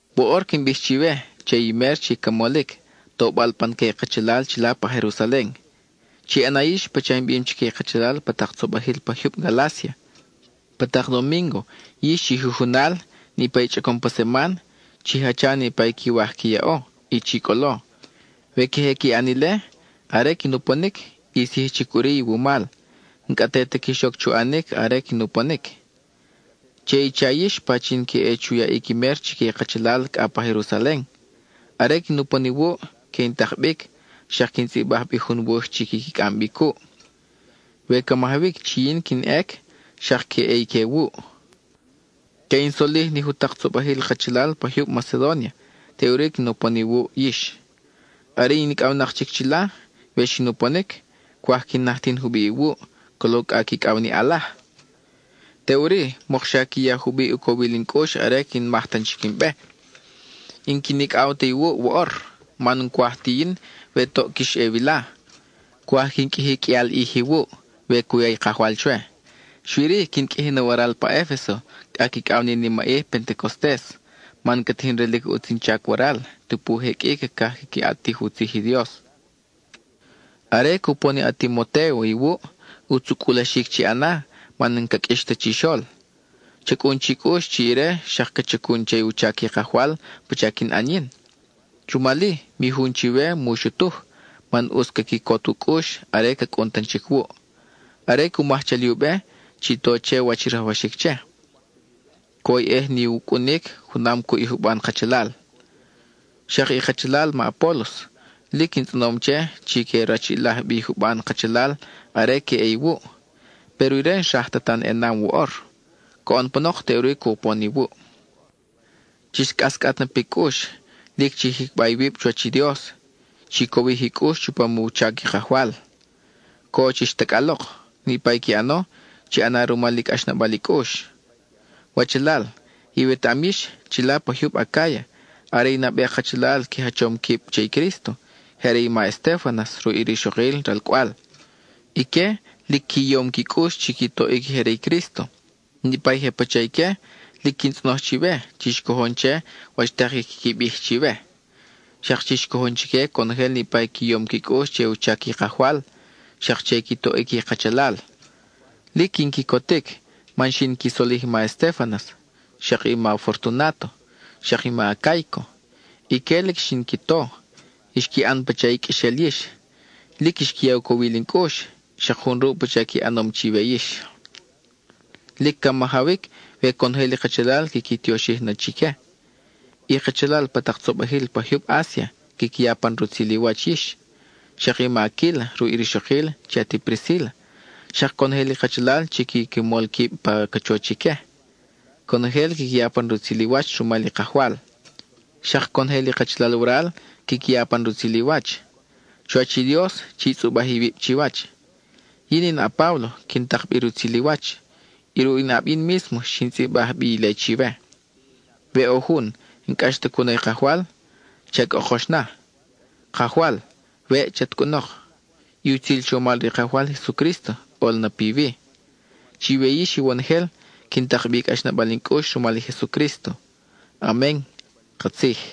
Woʼor quin bij chiwe che i mer chi ca molic, tobal pan que i kachalal chila pa Jerusalen: chi ʼana yix pacha in bim chique i kachalal pa tak tzobajil pa jyub Galácia. Pa tak domíngo, yix chi jujunal, niʼpa i chʼacom pa seman, chi jacha niʼpa i quiwaj qui yaʼo, y chi cʼolo. We queje qui ʼan ile, are quin uponic, ʼis yij chic ʼuri iwumal, n-cʼa te ta quix oc chu ʼanic are quin uponic. Che i cha yix pachin que ʼe chu yaʼic i mer chique i kachalal cʼa pa Jerusalen. Are quin upon iwuʼ, que in tak bic, xak quin tzʼibaj bi jun wuj chi quiqui cʼam bi cuʼ. We ca majawic chi yin quin ʼec, xak que ʼe ique wuʼ. Que in solij ni jutak tzobajil kachalal pa jyub Macedónia, teʼuri quin upon iwuʼ yix, are in icʼawnak chic chila. We xin uponic, cwaj quin najtin jubiʼ iwuʼ, colo cʼa quicʼaw ni ʼalaj. Teʼuri, mokxa qui ya jubiʼ u cowil in cʼux are quin maj tan chic in be. N-quin icʼaw ta iwuʼ woʼor, man n-cwaj ti yin we toʼ quix ʼe wila; cwaj quin qʼuiji qʼuial ʼij iwuʼ, we cu ya i Kajwal chwe. Xui-ri, quin qʼuiji na waral pa Efeso, cʼa quicʼaw ni nimaʼij Pentecostes, man ca tijin relic ʼutz in chac waral, tupu je qʼui cacaj quiqui ʼatij u tzij i Dios. Are cupon i a-Timotéo iwuʼ, ʼutz u cʼulaxic chi ʼana man n-ca qʼuix ta chixol; cha cʼun chi cʼux chi ire xak ca chacun che u chac i Kajwal pacha quin ʼan yin. Rumal-i, mi jun chiwe mu xutuj, man ʼutz ca quicot u cʼux are ca cʼun tan chic wuʼ. Are cu maj chali u be, chi to che wach i rajwaxic che; cwoyʼej ni u cʼunic junam cuʼ i juban kachalal. Xak i kachalal ma Apólos, lic in tzʼonom che chi que rachiʼilaj bi i juban kachalal are que ʼe iwuʼ, péro ire n-xraj ta tan ʼenam woʼor; coʼon panok, teʼuri cupon iwuʼ. Chix cʼascʼat na pi cʼux, lic chi jicba iwib chuwach i Dios, chi cowij i cʼux chupam u chac i Kajwal, co chix tacʼalok. Niʼpa i qui ʼano, chi ʼana rumal i cʼaxnabal i cʼux. Wachalal, iwetaʼam yix, chila pa jyub Acáya, are i nabe kachalal qui jachom quib che i Crísto, je are i ma Estéfanas ruʼ i rixokil ralcʼwal. Ique lic qui yom qui cʼux chi qui toʼic i je re i Crísto. Niʼpa i je pacha ique, lic quin tzʼonoj chiwe, chix cojon che wach tak i quiqui bij chiwe. Xak chix cojon chique conojel niʼpa i qui yom qui cʼux che u chac i Kajwal xak che i qui toʼic i kachalal. Lic quin quicotic, man xin qui solij i ma Estéfanas, xak i ma Fortunáto, xak i ma Acáico. Ique lic xin qui to, xqui ʼan pacha i qʼuexel yix. Lic xqui ya u cowil in cʼux, xak jun ruʼ pacha qui ʼanom chiwe yix. Lic ca majawic we conojel i kachalal quiqui tioxij na chique. I kachalal pa tak tzobajil pa jyub Asia, quiqui ya pan rutzil i wach yix. Xak i ma Aquíla ruʼ i rixokil chi ati Priscíla, xak conojel i kachalal chi quiqui mol quib pa cachoch ique, conojel quiqui ya pan rutzil i wach rumal i Kajwal. Xak conojel i kachalal waral quiqui ya pan rutzil i wach. Chuwach i Dios, chi tzʼubaj iwib chiwach. Yin in a-Páblo, quin tak bi rutzil i wach; y ruʼ in ʼab yin mísmo xin tzʼibaj bi ile chiwe. We ʼo jun, n-cʼax ta cu na i Kajwal, ¡cha cʼokox na! ¡Kajwal, weʼ chat cʼunok! I utzil chomal re i Kajwal Jesucrísto ʼol na piwi. Chiwe yix iwonojel, quin tak bi i cʼaxnabal in cʼux rumal i Jesucrísto. Amen (katzij).